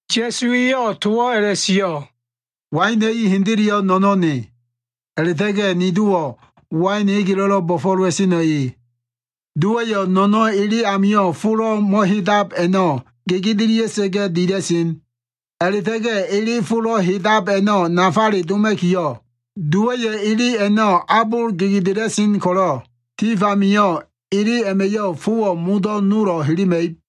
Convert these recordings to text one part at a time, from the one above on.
Ya꞉su eyo꞉ towo꞉ a꞉la꞉sio꞉, “Waina꞉ i hendeleyo꞉ no꞉no꞉n ne. A꞉la꞉ta꞉ga꞉ ni Dowo꞉ wain egelo꞉lo꞉ bo꞉fo꞉lowa꞉seno꞉ e. Dowa꞉yo꞉ no꞉no꞉n ele amilo꞉ folo꞉ mo꞉hedab a꞉no꞉ gegedelia꞉sa꞉ga꞉ dila꞉sen. A꞉la꞉ta꞉ga꞉ ele folo꞉ hedab a꞉no꞉ nafale doma꞉kiyo꞉, Dowa꞉yo꞉ ele a꞉no꞉ abol gegedela꞉sen ko꞉lo꞉, tif amio꞉ ele a꞉ma꞉yo꞉ fowo꞉ modo꞉ nolo꞉ helema꞉ib.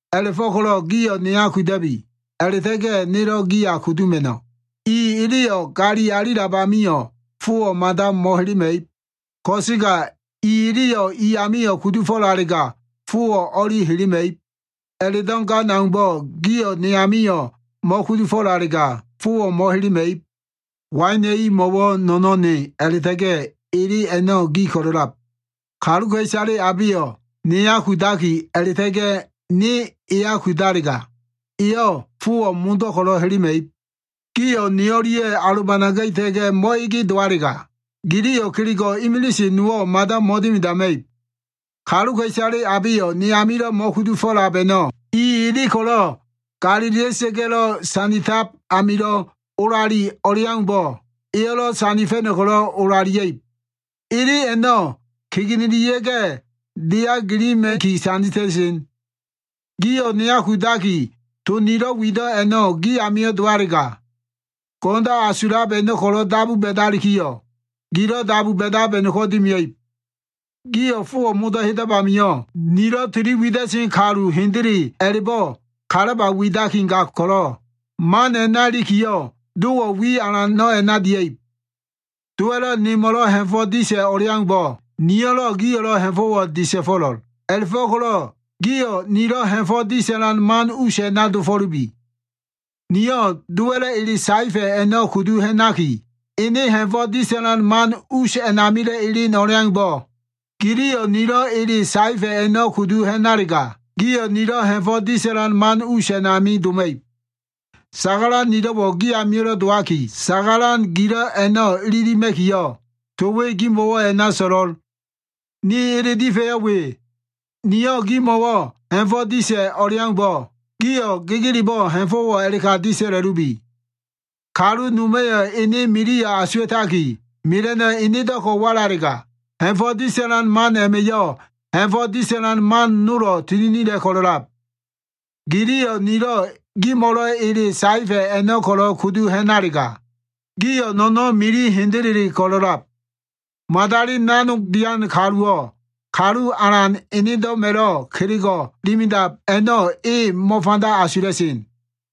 A꞉la꞉fo꞉ko꞉lo꞉ gio꞉ neya kuda꞉bi. A꞉la꞉ta꞉ga꞉ nelo꞉ giya kuduma꞉no꞉. I eleyo꞉ gali alilab amio꞉, fowo꞉ mada mo꞉helema꞉ib. Ko꞉sega i eleyo꞉ i amio꞉ kudufo꞉lalega, fowo꞉ o꞉li helema꞉ib. A꞉la꞉do꞉ gan aumbo꞉ gio꞉ ne amio꞉ mo꞉kudufo꞉lalega, fowo꞉ mo꞉helema꞉ib. “Waina꞉ i mo꞉wo꞉ no꞉no꞉n ne a꞉la꞉ta꞉ga꞉ ele a꞉no꞉ gi ko꞉lo꞉lab. Kaluka꞉isale abeyo꞉ neya kudaki, a꞉la꞉ta꞉ga꞉ ne eya kudalega, eyo꞉ fowo꞉ modo꞉ ko꞉lo꞉ helema꞉ib. Gio꞉ ne o꞉lia꞉yo꞉ alobanaga꞉ita꞉ga꞉ mo꞉ege dowalega, giliyo꞉ kelego꞉ imilise nowo꞉ mada mo꞉dimidama꞉ib. Kaluka꞉isale abeyo꞉ ne amilo꞉ mo꞉kudufo꞉lab a꞉no꞉, i ele ko꞉lo꞉ sanditab amilo꞉ olali o꞉leaumbo꞉, eyo꞉lo꞉ sandifa꞉no꞉ ko꞉lo꞉ olalia꞉ib. Ele a꞉no꞉ kegenelia꞉ga꞉, deya gilima꞉ki sandita꞉sen. Gio꞉ neya kudaki, to nilo꞉ wido꞉ a꞉no꞉ gi amio꞉ dowalega, go꞉no꞉ndo꞉ asulab a꞉no꞉ ko꞉lo꞉ dabu ba꞉dalikiyo꞉, gilo꞉ dabu ba꞉dab a꞉no꞉ko꞉ dimia꞉ib. Gio꞉ fowo꞉ modo꞉ hedab amio꞉, nilo꞉ tili wida꞉sen kalu hendele a꞉la꞉bo꞉ kalaba widaki gab ko꞉lo꞉, man a꞉na ilikiyo꞉ Dowo꞉ wi alano꞉ a꞉na dia꞉ib. “Dowa꞉lo꞉ nemo꞉lo꞉ ha꞉fo꞉ disa꞉ o꞉leaumbo꞉, niyo꞉lo꞉ gio꞉ ha꞉fo꞉wo꞉ disa꞉fo꞉lo꞉l. A꞉la꞉fo꞉ko꞉lo꞉ gio꞉ nilo꞉ ha꞉fo꞉ disa꞉lan man us a꞉na dofo꞉lubi. Niyo꞉ Dowa꞉lo꞉ ele saefa꞉ a꞉no꞉ kudu ha꞉naki, ene ha꞉fo꞉ disa꞉lan man us amilo꞉ elen o꞉leaumbo꞉, giliyo꞉ nilo꞉ ele saefa꞉ a꞉no꞉ kudu ha꞉nalega, gio꞉ nilo꞉ ha꞉fo꞉ disa꞉lan man us a꞉nami doma꞉ib. Sagalan nilo꞉wo꞉ gi amio꞉lo꞉ dowaki, sagalan gilo꞉ a꞉no꞉ ililima꞉kiyo꞉, to we gimo꞉wo꞉ a꞉na so꞉lo꞉l. “Ni ele difa꞉yo꞉ we. Niyo꞉ gimo꞉wo꞉ ha꞉fo꞉ disa꞉ o꞉leaumbo꞉, gio꞉ gegelebo꞉ ha꞉fo꞉wo꞉ a꞉la꞉ka disa꞉la꞉lubi. Kalu noma꞉yo꞉ ene miliyo꞉ asuwa꞉taki, mela꞉no꞉ enedo꞉ ko꞉ walalega, ha꞉fo꞉ disa꞉lan man a꞉ma꞉yo꞉, ha꞉fo꞉ disa꞉lan man nolo꞉ tininila꞉ ko꞉lo꞉lab. Giliyo꞉ nilo꞉ gimo꞉lo꞉ ele saefa꞉ a꞉no꞉ ko꞉lo꞉ kudu ha꞉nalega, gio꞉ no꞉no꞉n mili hendele ko꞉lo꞉lab. Madali nanog dian kaluwo꞉ kalu alan enedo꞉ma꞉lo꞉ kelego꞉ dimidab a꞉no꞉ e mo꞉fanda asula꞉sen.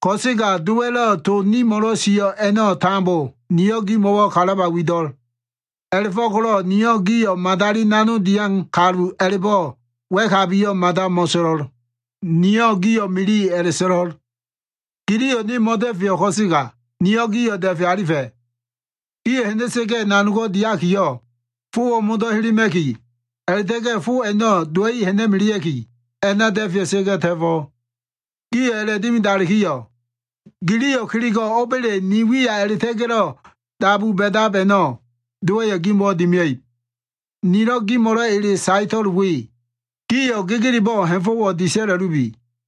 Ko꞉sega Dowa꞉lo꞉ to nimo꞉lo꞉ sio꞉ a꞉no꞉ tambo niyo꞉ gimo꞉wo꞉ kalaba wido꞉. A꞉la꞉fo꞉ko꞉lo꞉ niyo꞉ gio꞉ ‘madali nanog dian kalu’ a꞉la꞉bo꞉ wa꞉kabiyo꞉ mada mo꞉so꞉lo꞉l. Niyo꞉ gio꞉ ‘mili’ a꞉la꞉so꞉lo꞉l. Giliyo꞉ ne mo꞉da꞉feyo꞉ ko꞉sega, niyo꞉ gio꞉ da꞉fe alifa꞉. Gio꞉ ha꞉na꞉sa꞉ga꞉ nanogo꞉ diakiyo꞉, fowo꞉ modo꞉ helema꞉ki, a꞉la꞉ta꞉ga꞉ fo a꞉no꞉ dowa꞉i ha꞉na꞉melea꞉ki, a꞉na da꞉fea꞉sa꞉ga꞉ ta꞉fo꞉. Gio꞉ a꞉la꞉dimidalikiyo꞉, giliyo꞉ kelego꞉ o꞉ba꞉le ni wiya a꞉la꞉ta꞉ga꞉lo꞉ dabu ba꞉dab a꞉no꞉, Dowa꞉yo꞉ gimo꞉wo꞉ dimia꞉ib. Nilo꞉ gimo꞉lo꞉ ele saeto꞉l we. Gio꞉ gegelebo꞉ ha꞉fo꞉wo꞉ disa꞉la꞉lubi.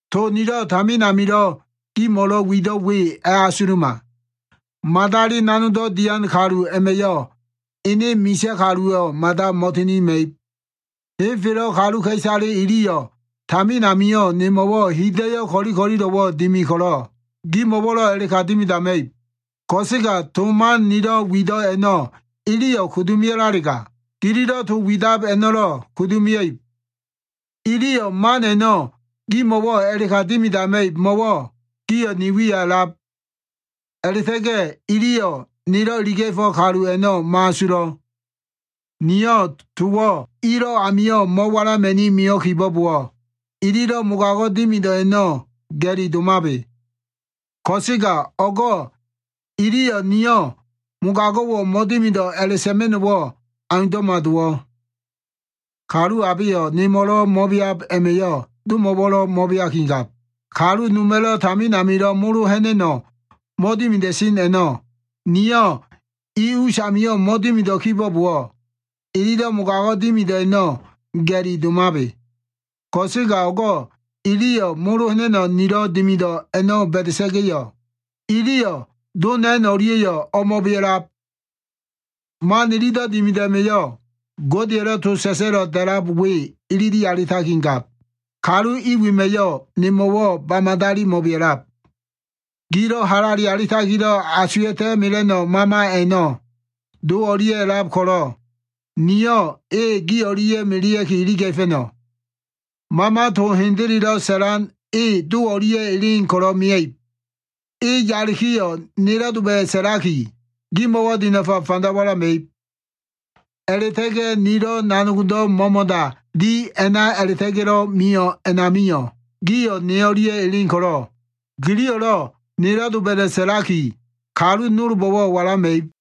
To nilo꞉ tamin amilo꞉ gimo꞉lo꞉ wido꞉ we a꞉asuluma. ‘Madali nanogdo꞉ dian kalu a꞉ma꞉yo꞉ ene misa꞉ kaluwo꞉ mada mo꞉tininima꞉ib.’ Henfelo꞉ kaluka꞉isale iliyo꞉ tamin amio꞉ nemo꞉wo꞉ hida꞉yo꞉ ko꞉li ko꞉lilo꞉wo꞉ dimi ko꞉lo꞉, gimo꞉wo꞉lo꞉ a꞉la꞉ka dimidama꞉ib. Ko꞉sega to man nilo꞉ wido꞉ a꞉no꞉ iliyo꞉ kudu mio꞉lalega, gililo꞉ to widab a꞉no꞉lo꞉ kudu mia꞉ib. Iliyo꞉ man a꞉no꞉ gimo꞉wo꞉ a꞉la꞉ka dimidama꞉ib mo꞉wo꞉ gio꞉ ni wiya a꞉lab. A꞉la꞉ta꞉ga꞉ iliyo꞉ nelo꞉ iliga꞉fo꞉ kalu a꞉no꞉ mo꞉asulo꞉. Niyo꞉ towo꞉ ilo꞉ amio꞉ mo꞉walama꞉ni mio꞉ kibo꞉bowo꞉, ililo꞉ mogago꞉ dimido꞉ a꞉no꞉ ga꞉li domabe. Ko꞉sega o꞉go꞉ iliyo꞉ ‘Niyo꞉ mogago꞉wo꞉ mo꞉dimido꞉’ a꞉la꞉sa꞉ma꞉no꞉wo꞉ aundo꞉ma dowo꞉. Kalu abeyo꞉ nemo꞉lo꞉ mo꞉beab a꞉ma꞉yo꞉, Domo꞉wo꞉lo꞉ mo꞉beakigab. Kalu noma꞉lo꞉ tamin amilo꞉ molo ha꞉na꞉no꞉ mo꞉dimida꞉sen a꞉no꞉ niyo꞉ i usamio꞉ mo꞉dimido꞉ kibo꞉bowo꞉, ililo꞉ mogago꞉ dimido꞉ a꞉no꞉ ga꞉li domabe. Ko꞉sega o꞉go꞉ iliyo꞉ molo ha꞉na꞉no꞉ nilo꞉ dimido꞉ a꞉no꞉ ba꞉da꞉sa꞉ga꞉yo꞉, iliyo꞉ Do na꞉n o꞉lia꞉yo꞉ o꞉mo꞉bea꞉lab. Man ililo꞉ dimido꞉ a꞉ma꞉yo꞉, Godeya꞉lo꞉ to sa꞉sa꞉lo꞉ da꞉lab we ilili alitakigab, ‘Kalu i wema꞉yo꞉ nemo꞉wo꞉ ba madali mo꞉bea꞉lab.’ “Gilo꞉ halale alitakilo꞉ asuwa꞉ta꞉ mela꞉no꞉ Mama a꞉no꞉ Do o꞉lia꞉ a꞉lab ko꞉lo꞉, niyo꞉ e gi o꞉lia꞉ melea꞉ki iliga꞉fa꞉no꞉. Mama to hendelelo꞉ sa꞉lan e Do o꞉lia꞉ elen ko꞉lo꞉ mia꞉ib. E yalikiyo꞉ nelo꞉ doba꞉da꞉ sa꞉laki, gimo꞉wo꞉ dinafa fanda walama꞉ib. A꞉la꞉ta꞉ga꞉ nilo꞉ nanogdo꞉ mo꞉mo꞉da dilo꞉ a꞉na a꞉la꞉ta꞉ga꞉lo꞉ mio꞉ a꞉namio꞉, gio꞉ ne o꞉lia꞉ elen ko꞉lo꞉, giliyo꞉lo꞉ nelo꞉ doba꞉da꞉ sa꞉lakiyo꞉, kalu nolbo꞉wo꞉ walama꞉ib.”